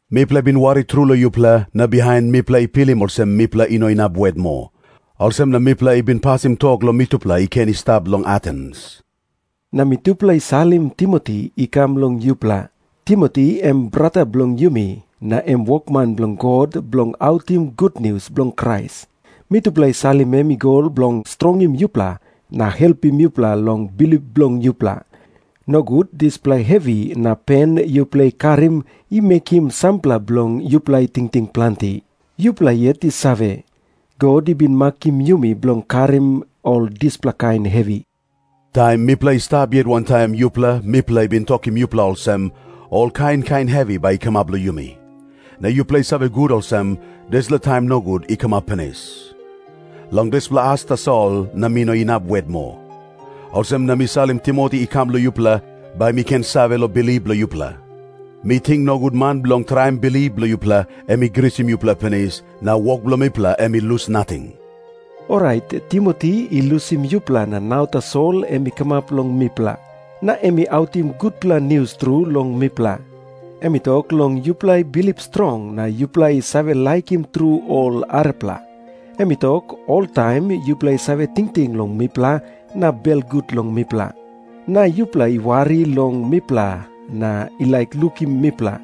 Mipela i bin wari tru long yupela, na bihain mipela i pilim olsem mipela i no inap wet moa. Olsem na mipela i bin pasim tok long mitupela i ken i stap long Atens, na mitupela i salim Timoti i kam long yupela. Timoti em brata bilong yumi na em wokman bilong God bilong autim gutnius bilong Krais. Mitupela i salim em i go bilong strongim yupela na helpim yupela long bilip bilong yupela, nogut dispela hevi na pen yupela i karim i mekim sampela bilong yupela i tingting planti. Yupela yet i save, God i bin makim yumi bilong karim ol dispela kain hevi. Taim mipela i stap yet wantaim yupela mipela i bin tokim yupela olsem, ol kain kain hevi bai i kamap long yumi. Na yupela i save gut olsem, dispela taim nogut i kamap pinis. Long dispela as tasol na mi no inap wet moa. Olsem na mi salim Timoti i kam long yupela, bai mi ken save long bilip bilong yupela. Mi ting, nogut man bilong traim bilip bilong yupela em i grisim yupela pinis, na wok bilong mipela em i lus nating. Orait Timoti i lusim yupela na nau tasol em i kamap long mipela. Na em i autim gutpela nius tru long mipela. Em i tok long yupela i bilip strong na yupela i save laikim tru ol arapela. Em i tok, oltaim yupela i save tingting long mipela na belgut long mipela. Na yupela i wari long mipela na i laik lukim mipela,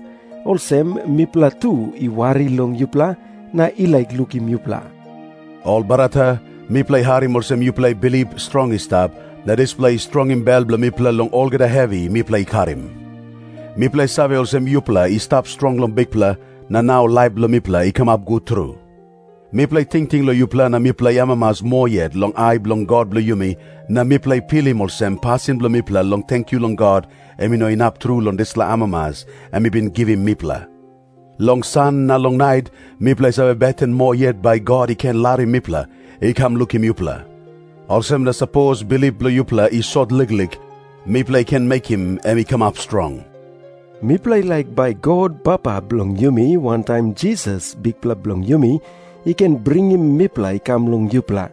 olsem mipela tu i wari long yupela na i laik lukim yupela. Ol brata, mipela i harim olsem yupela i bilip strong i stap, na dispela i strongim bel bilong mipela long olgeta hevi mipela i karim. Mipela i save olsem yupela i stap strong long Bikpela, na nau laip bilong mipela i kamap gut tru. Mipela i tingting long yupela na mipela i amamas moa yet long ai bilong God bilong yumi, na mipela i pilim olsem pasin bilong mipela long tenkyu long God em i no inap tru long dispela amamas em i bin givim mipela. Long san na long nait mipela i save beten moa yet bai God i ken larim mipela i kam lukim yupela. Olsem na sapos bilip bilong yupela i sot liklik, mipela i ken mekim em i kamap strong. Mipela i laik bai God Papa bilong yumi, wantaim Jisas, Bikpela bilong yumi, i ken bringim mipela i kam long yupela.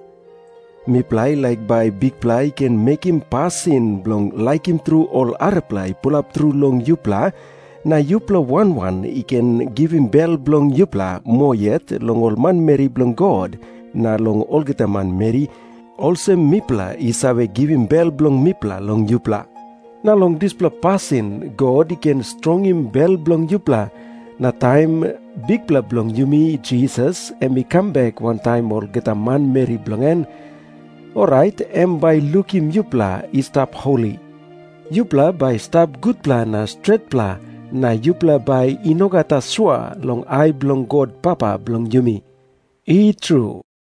Mipela i laik bai Bikpela i ken mekim pasin bilong laikim tru ol arapela i pulap tru long yupela, na yupela wan wan i ken givim bel bilong yupela moa yet long ol manmeri bilong God na long olgeta manmeri, olsem mipela i save givim bel bilong mipela long yupela. Na long dispela pasin God i ken strongim bel bilong yupela, na taim Bikpela bilong yumi Jisas em i kam bek wantaim olgeta manmeri bilong en, orait em bai i lukim yupela i stap holi. Yupela bai i stap gutpela na stretpela na yupela bai i no gat asua long ai bilong God Papa bilong yumi. I tru.